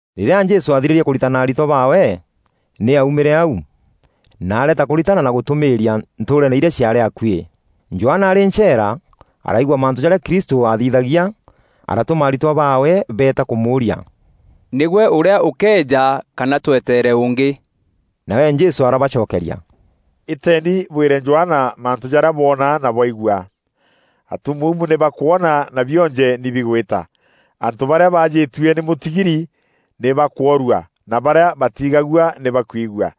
Rîrîa Jesû aathirîrie kûritana aritwa baawe, nî aumîre au, na areeta kûritana na gûtûmîîria ntûûreene irîa ciaarî akuî. Johana arî ncheera, araigua mantû jarîa Kristû aathithagia. Aratûma aritwa baawe beeta kûmûûria: “Nîgwe ûrîa ûkeeja kana tweteere ûngî?” Nawe Jesû arabacokeria, “Îteeni bwîre Johana mantû jarîa bwoona na bwaigua: atumuumu nî bakwona na bionje nî bigwîta, antû barîa baajîtue nî mûtigiri nî bakûorua na barîa batiigagua nî bakwigua;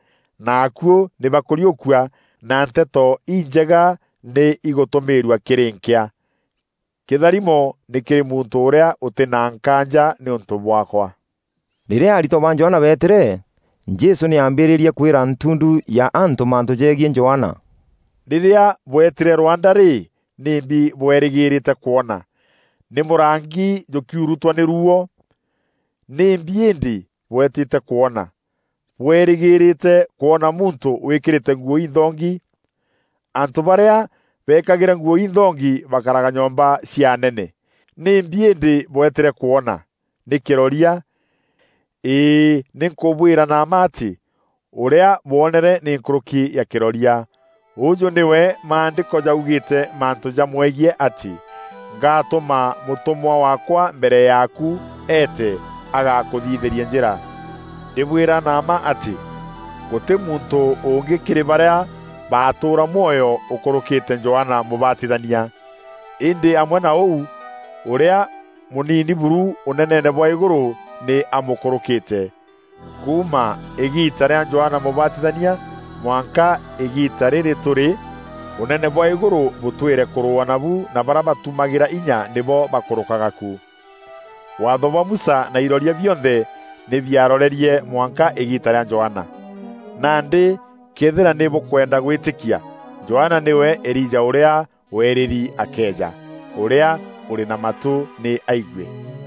na akuû nî bakûriûkua na Nteto Injega nî igûtûmîîrua kîrî nkîa. Kîtharimo nî kîrî muntû ûrîa ûtî na nkaanja nîûntû bwaakwa.” Rîrîa aritwa ba Johana beetîre, Jesû nî aambîîrîrie kwîra ntundu ya antû mantû jegiî Johana: “Rîrîa bwetîîre rwanda rî, nîmbi bwerîgîrîte kwona? Nî mûrangi jûkiurutwa nî ruuo? Nîmbi îndî bwetîte kwona? Bwerîgîrîte kwona muntû wîkîrîte nguû inthongi? Antû barîa beekagîra nguû inthongi bakaraga nyomba cia anene. Nîmbi îndî, bwetîre kwona? Nî kîroria? Îî nî nkûbwîra na mma atî, ûrîa bwoonere nî nkûrûki ya kîroria. “Ûjû nîwe Maandîko jaugîîte mantû jamwegiî atî: ‘Ngatûma mûtûmwa waakwa mbere yaaku eete agakûthithîrie njîra.’ Ndîbwîra na mma atî, gûtî muntû ûngî kîrî barîa batûûra mwoyo ûkûrûkîte Johana Mûbatithania. Îndî amwe na ûu ûrîa mûnini buru ûneneene bwa îgûrû nî amûkûrûkîte. Kuuma îgiita rîa Johana Mûbatithania mwanka îgiita rîrî tûrî ûnene bwa îgûrû bûtwîre kûrûûwa nabu na barîa batumagîra inya nîbo bakûrûkaga ku. Waatho bwa Musa na iroria bionthe nî biarorerie mwanka îgiita rîa Johana. Nandî këethîra nî bûkwenda gwîtîkia, Johana nîwe Elija ûrîa weerîri akeeja. Ûrîa ûrî na matû nî aigue.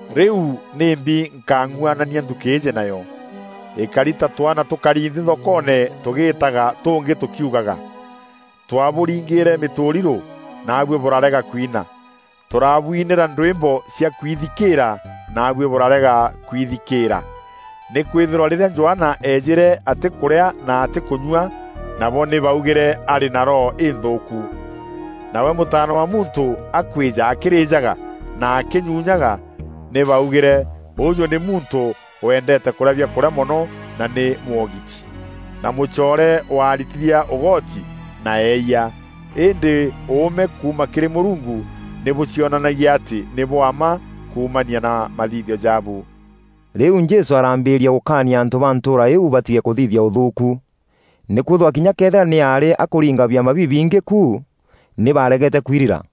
Rîu nîmbi nkang'uanania nthukî îîjî nayo? Îkari ta twaana tûkari nthî thokoone tûgîtaaga tûngî tûkiugaga: ‘Twabûringîîre mîtûrirû naabuî bûrarega kwina, tûrabwinîra ndwîmbo cia kwithikîîra naabuî bûrarega kwithikîîra!’ Nîkwîthîrwa rîrîa Johana eejîre atîkûrîa na atîkûnyua, nabo nî baugîre, ‘Arî na roho înthûûku.’ Nawe Mûtaana wa Muntû akwîja akîrîjaga na akînyunyaga, nî baugîre, ‘Ûjû nî muntû wendeete kûrîa biakûrîa mono na nî mwogiti, na mûcoore wa aritithia ûgoti na eeyia!’ Îndî ûûme kuuma kîrî Mûrungu nî bûcionanagia atî nî bwa mma kuumania na mathithio jaabu.” Rîu Jesû araambîîrîa gûkaania antû ba ntûûra iu batige kûthithia ûthûûku, nîkwîthîrwa kinya këethîra nî aarî akûringa biama bibingî ku, nî baregete kwirira.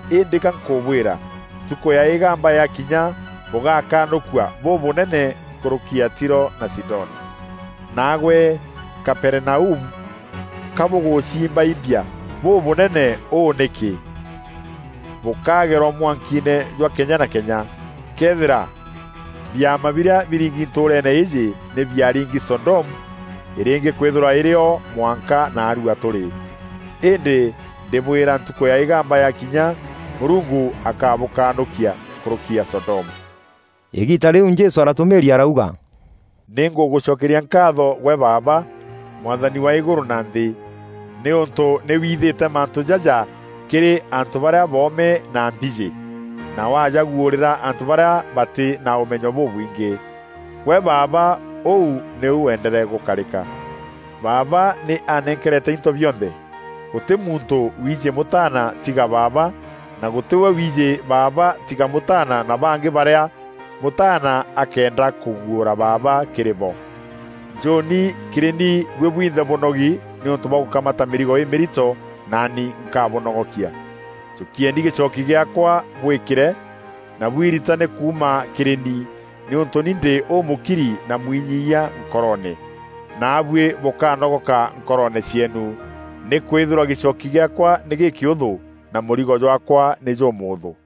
Îndî gankûbwîra, ntukû ya îgamba yakinya bûgakanûkua bûbûnene nkûrûki ya Tiro na Sidoni. Naagwe Kaperinaumu, ka bûgûciimbaimbia bûbûnene ûû nîkî? Bûkagerwa mwankiine jwa kenya na kenya! Këethîra biama birîa biringi ntûûreene îîjî, nî biaringi Sodomu, îrîngî kwîthîrwa îrî o mwanka naarua tûrî. Îndî ndîbwîra ntukû ya îgamba yakinya, Mûrungu akabûkanûkia nkûrûki ya Sodomu.” Îgiita rîu Jesû aratûmîîria arauga, “Nî ngûgûcokeria nkaatho gwe Baaba, Mwathani wa îgûrû na nthî, nîûntû nî wiithîte mantû jaja kîrî antû barîa boome na mbîjî, na wajaguûrîra antû barîa batî na ûmenyo bûbwingî. Gwe Baaba, ûu nîu wendere gûkarîka. “Baaba nî anenkerete into bionthe. Gûtî muntû wiijî Mûtaana tiga Baaba, na gûtî we wiijî Baaba tiga Mûtaana na bangî barîa Mûtaana akeenda kûguûra Baaba kîrî bo. Njûûni kîrî ni buî bwinthe bûnogi nîûntû bwa gûkamata mîrigo îmîrito, naani nkabûnogokia. Jûkieni gîchooki gîaakwa bwîkîre, na bwiritane kuuma kîrî ni, nîûntû ni ndî ûmûkiri na mwinyiiyia nkoroone, naabuî bûkanogoka nkoroone cieenu. Nîkwîthîrwa gîchooki gîaakwa nî gîkîûthû, na mûrigo jwaakwa nî jûmûûthû.”